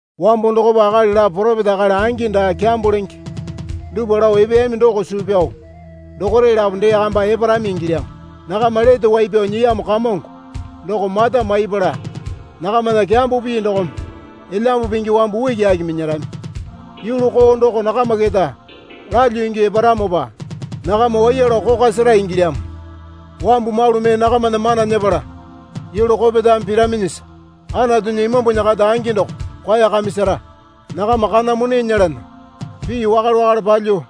Wambo dokopa akali lapo poropeta akali angi daa kyambo lenge dupwa lao epeyami doko suu pyao dokore lapo dee kamba eparami ingilyamo. Nakama Lete Wai Pyao Nyiyamo Kamongo doko mata maipala nakamana kyambo pii dokome Elyambu Pingi wambu ukiaki minyarami. Yulu koo doko nakama keta lalyuo ingyuo eparamopa nakama waiya lao kokwa sera ingilyamo. Wambu malu mee nakamana mana nyepala yulu kopetame piraminyisa Anatunya Imambunya kata angi doko kwaeyakamisara. Nakama kana mone nyelana pii wakale wakale palyuo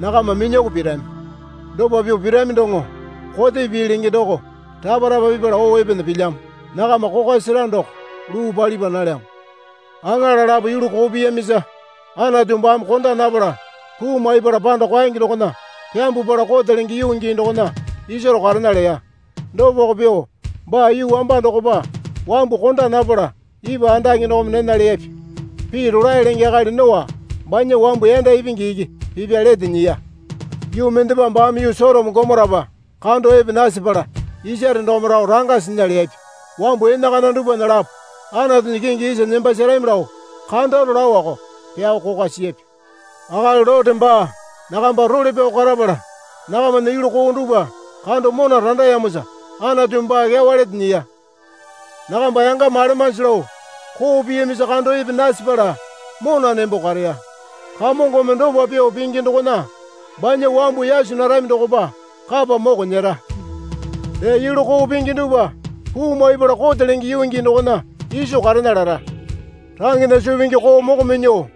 nakama minyuoko pirami. Dopa pyuo pirami doŋo Kote Pii Lenge doko rapa rapa pipala oo epena pilyamo. Nakama Kokwa Sera Doko luu palipa nalyamo. Aŋala lapo yulu koo piyamisa Anatu baame konda napala puu maipala panda kwaenge dokona pyambwapala kote lenge yuu gii dokona isaro karena leya. Dopako pyuo baa yuu wamba dokopa wambu konda napala ipwa andake dokome nena leyapya. Pii rolae lenge akali Noa banya wambu yanda ipingi iki pipya lete nyiya. Yuu mendepa baame yuu Sotoma Gomorapa kando epe nasepala isare dokome rao ranga sinya leyapya. Wambu enakana dupwana lapo Anatunya kingi isa nembasarami lao kandaro laoko pyao kokwa siyapya. Akali Lote baa nakamba role pyao karapala nakamana yulu koo dupwa kando mona randayamosa Anatumi baa kyawa lete nyiya. Nakamba yangama alemanji lao koo piyamisa kando epe nasepala mona nembo kareya. Kamongome dopa pyuo pingi dokona banya wambu yaso narami dokopa kapa moko nyera. Dee yulu koo pingi dupwa puu maipala Kote Lenge Yuu Gii dokona iso karena lara. Rangena suu pingi koo moko minyuo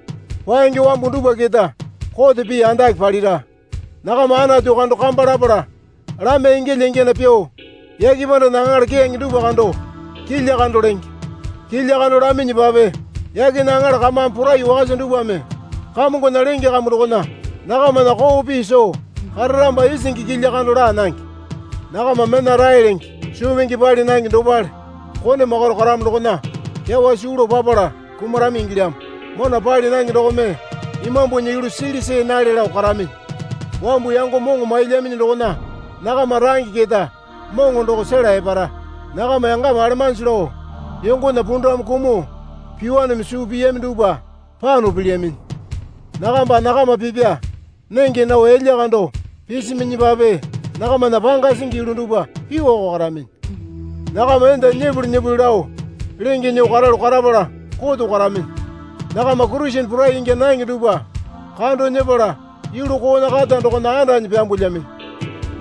paenge wambu dupwa keta kote pii andake palira. Nakama Anatu kando kamba lapala lamya ingyalya ingyana pyuo yake pandana aŋala keyange dupwa kando kilya kando lenge. Kilya kando laminyipape yakena aŋala kamame porai wakasa dupwame Kamongona lenge kambu dokona nakamana koo pii soo kararamopa isingi kilya kando laa nange. Nakama mena rae lenge suu pingi pali nange dopale kone makaro karamo dokona kyawa suu lao papala kumarami ingilyamo. Mona pali nange dokome imambunya yulu sili see nale lao karaminyi. Wambu yango moŋo mailyaminyi dokona nakama range keta moŋo doko sela epara. Nakama yangama alemanji lao yongona pundamu kumuo pyuowaneme suu piyami dupwa pano pilyaminyi. Nakamba nakama pipya nenge nao yalya kando pisiminyipape nakamana panga singi yulu dupwa pyuoko karaminyi. Nakama enda nyipuli nyipuli lao lenge nyuo karalu karapala koto karaminyi. Nakama Kurisene porai ingya nange dupwa kando nyepala yulu koona kata dokona andanyi pyambulyaminyi.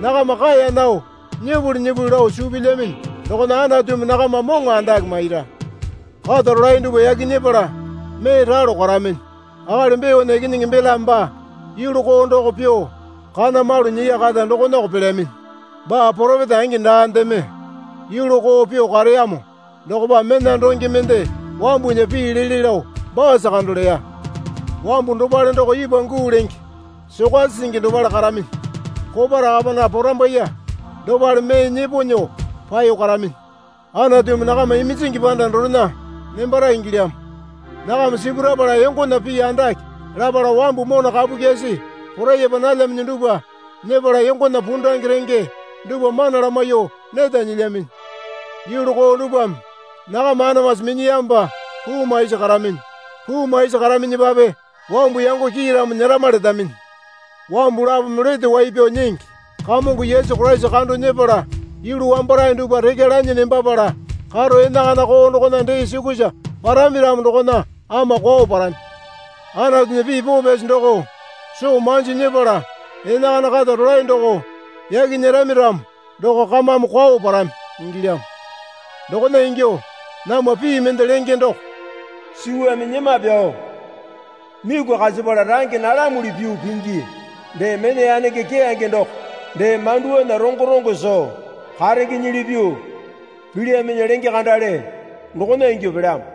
Nakama kaeya nao nyipuli nyipuli lao suu pilyaminyi dokona Anatumi nakama moŋo andake maira. Kata rolae dupwa yaki nyepala mee ralo karaminyi. Akali Beona ikinyingi Belame baa yulu koo doko pyuo kana malu nyiya kata dokonako pelyaminyi. Baa poropeta angi daandeme yulu koo pyuo kareyamo dokopa mena donge mende wambunya pii lele lao baasa kando leya. Wambu dopale doko ipwa guu lenge sokasi singi dopale karaminyi. Kopa rakapana porambaiye dopale mee nyepo nyuo paeyo karaminyi. Anatumi nakama iminjingi panda dorena nembara ingilyamo. Nakama sipurapala yongona pii andake lapala wambu mona kapu kyasi poraiyapa nalyaminyi dupwa nyepala yongona pundange renge dupwa mana lamaiyuo neta nyilyaminyi. Yulu koo dupwame nakama anamasi minyiyamopa puu maisi karaminyi. Puu maisi karaminyipape wambu yango kiiramo nyerama letaminyi. Wambu lapome Lete Wai Pyao Nyingi Kamongo Yesu Koraisa kando nyepala yulu wambarae dupwa rekya lanyi nembapala karo enakana koo dokona dee sukusa parami ramo dokona ama kwao parami. Anatunya pii poo pyasi doko soo manjo nyepala enakana kata rolae doko yaki nyerami ramo doko kamame kwao parami ingilyamo. Dokona ingyuo namwa pii mende lenge doko, Suwame nyema pyao miku kasipala range nalamuli pyuo pingi. Dee mena yanenge keyange doko dee manduwanya rongo rongo soo karengenyili pyuo pilyaminyi lenge kandale dokona ingyuo pelyamo.